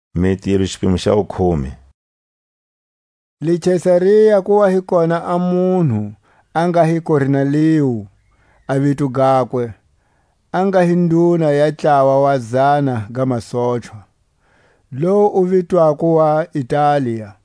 Pedro na Korneliu. Le Kesaria ku wa hi kona a munhu a nga hi Korneliu a vito gakwe, a nga hi nduna ya ntlawa wa zana ga masochwa, lowu wu vitwako wa Italia.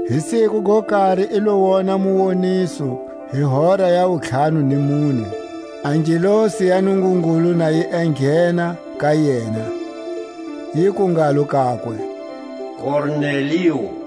Hi siku go kari i lo wona muwoniso hi hora ya wuntlhanu ni mune, a ngelosi ya Nungungulu na yi enghena ka yena, yiku ngalo kakwe: Korneliu!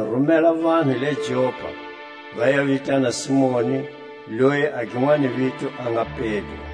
Makunu rumela vanhu le Jopa, va ya vitana Simoni, loyi a ginwani vito a nga Pedro;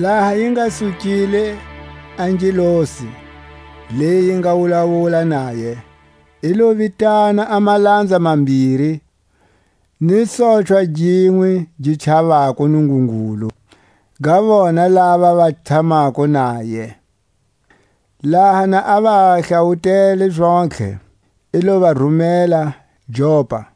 Laha yi nga sukile a ngelosi leyi yi nga wulawula naye, i lo vitana a malanza mambiri, ni sochwa ginwe gi chavako Nungungulu, ga vona lava va tshamako naye; laha na a va hlawutele zontlhe, i lo va rumela Jopa.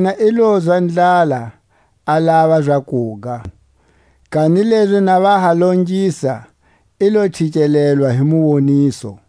Yena i lozwa ndlala, a lava zakuga; kanilezi na va ha longisa, i lo chikelelwa hi muwoniso;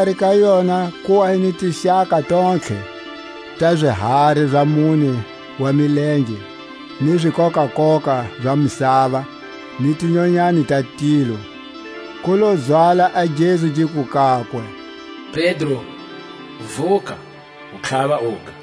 Xikari ka yona ku wa hi ni tixaka tontlhe ta zihari za mune wa milenge, ni zikokakoka za misava ni tinyanyani ta tilo. Ku lo zwala a gezu giku kakwe: Pedro, vuka, u tlhava uga.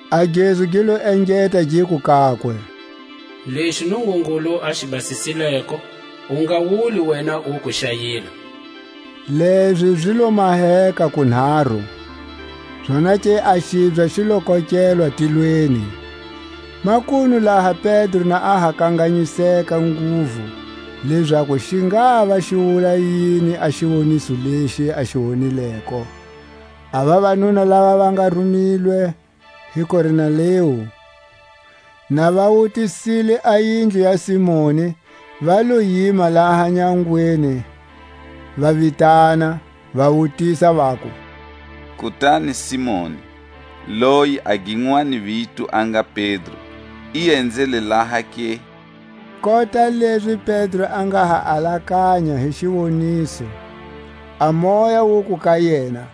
A gezu gi lo engeta giku kakwe: Lexi Nungungulu a xi basisileko, u nga wuli wena uku xa yila. Lezi zi lo maheka kunharu, zonake a xibya xi lo kokelwa tilweni. Makunu laha Pedro a nga ha kanganyiseka nguvu, lezaku xi ngava xi wula yini a xiwoniso lexi a xi wonileko, a vavanuna lava va nga rumilwe hi Korneliu, na va wutisile a yindlu ya Simoni, va lo yima laha nyangweni, va vitana, va wutisa, vaku: Kutani Simoni loyi a ginwani vito a nga Pedro, i enzele laha ke? Kota lezi Pedro a nga ha alakanya hi xiwoniso, a Moya wuku ka yena: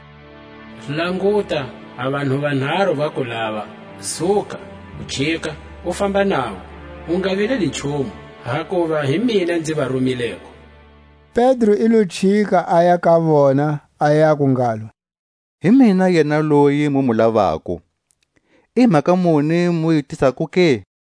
Languta, a vanhu vanharu va ku lava. Suka, u chika, u famba navo, u nga vileli nchumu; hakuva hi mina nzi va rumileko. Pedro i lo chika, aya ka vona, a yaku ngalo: Hi mina yena loyi mu mu lavako; i mhaka muni mu yi tisako ke?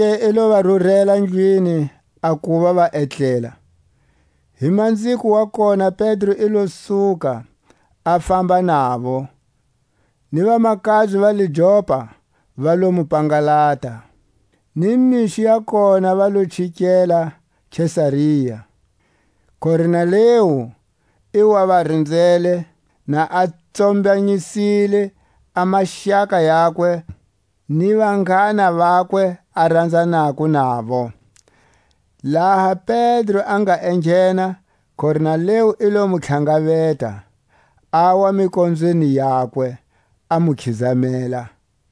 Zonake i lo va rurela ndlwini a kuva va etlela. Hi manziko wa kona Pedro i lo suka, a famba navo, ni vamakabye va le Jopa va lo mu pangalata. Ni mixo ya kona va lo chikela Kesaria. Korneliu i wa va rinzele, na a tsombanyisile a maxaka yakwe ni vanghana vakwe a ranzanako navo. Laha Pedro a nga enghena, Korneliu i lo mu tlhangaveta, awa mikonzweni yakwe, a mu khizamela.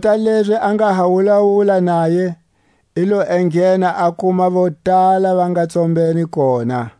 Kota lezi a nga ha wulawula naye, i lo enghena a kuma vo tala va nga tsombene kona;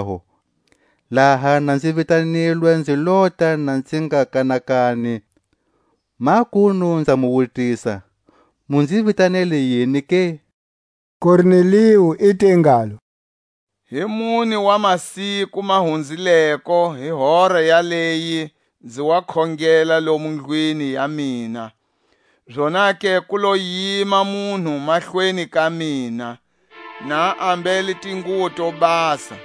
Hikwalaho laha na nzi vitanilwe nzi lota na nzi nga kanakani; makunu nza mu wutisa, mu nzi vitanele yini ke? Korneliu i te ngalo: Hi mune wa masiku ma hunzileko, hi hora yaleyi nzi wa khongela lomu ndlwini ya mina; zonake ku lo yima munhu mahlweni ka mina, na a ambele tinguwo to basa,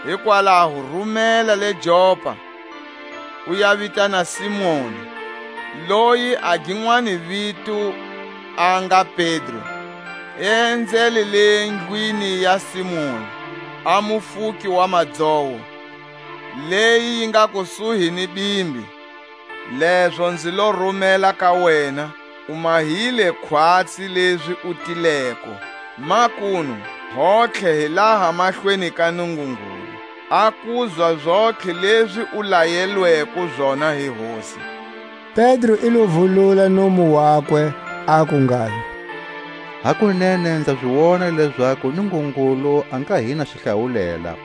Hikwalaho rumela le Jopa, u ya vitana Simoni, loyi a ginwani vito a nga Pedro; i enzele le ndlwini ya Simoni a mufuki wa madzowo, leyi yi nga kusuhi ni bimbi. Lezo nzi lo rumela ka wena; u mahile khwatsi lezi u tileko. Makunu hontlhe hi laha mahlweni ka Nungungulu, a kuzwa zontlhe lezi u layelweko zona hi Hosi. Pedro i lo vulula nomu wakwe, aku ngalo: Hakunene nza zi wona lezaku Nungungulu a nga hi na xihlawulela;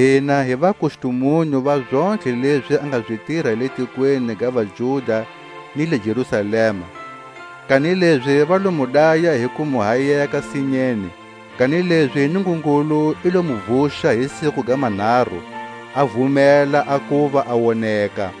Hina hi vakustumunyu va zontlhe lezi a nga zi tira le tikweni ga vaJuda ni le Jerusalema; kanilezi va lo mu daya hi ku mu hayeka sinyeni. Kanilezi Nungungulu i lo mu vuxa hi siku ga manharu, a vumela a kuva a woneka,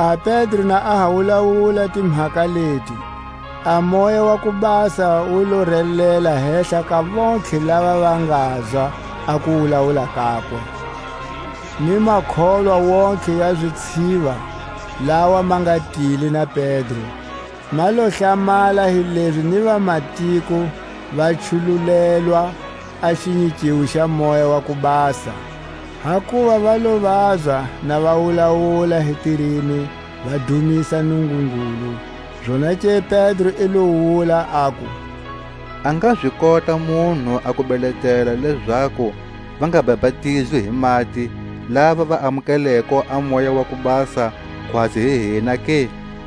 Laha Pedro na a ha wulawula timhaka leti, a Moya wa ku Basa wu lo relela hehla ka vontlhe lava va ngazwa a kuwulawula kakwe. Ni makholwa wontihe ya zitshiva, lawa ma nga tile na Pedro, ma lo hlamala hilezi ni vamatiko va chululelwa a xinyikiwo xa Moya wa ku Basa. Hakuva va lo vazwa na va wulawula hi tirimi va dumisa Nungungulu. Zonake Pedro i lo wula, aku: A nga zi kota munhu a ku beletela lezaku va nga bapatizwi hi mati, lava va amukeleko a Moya wa ku Basa khwatsi hi hina ke?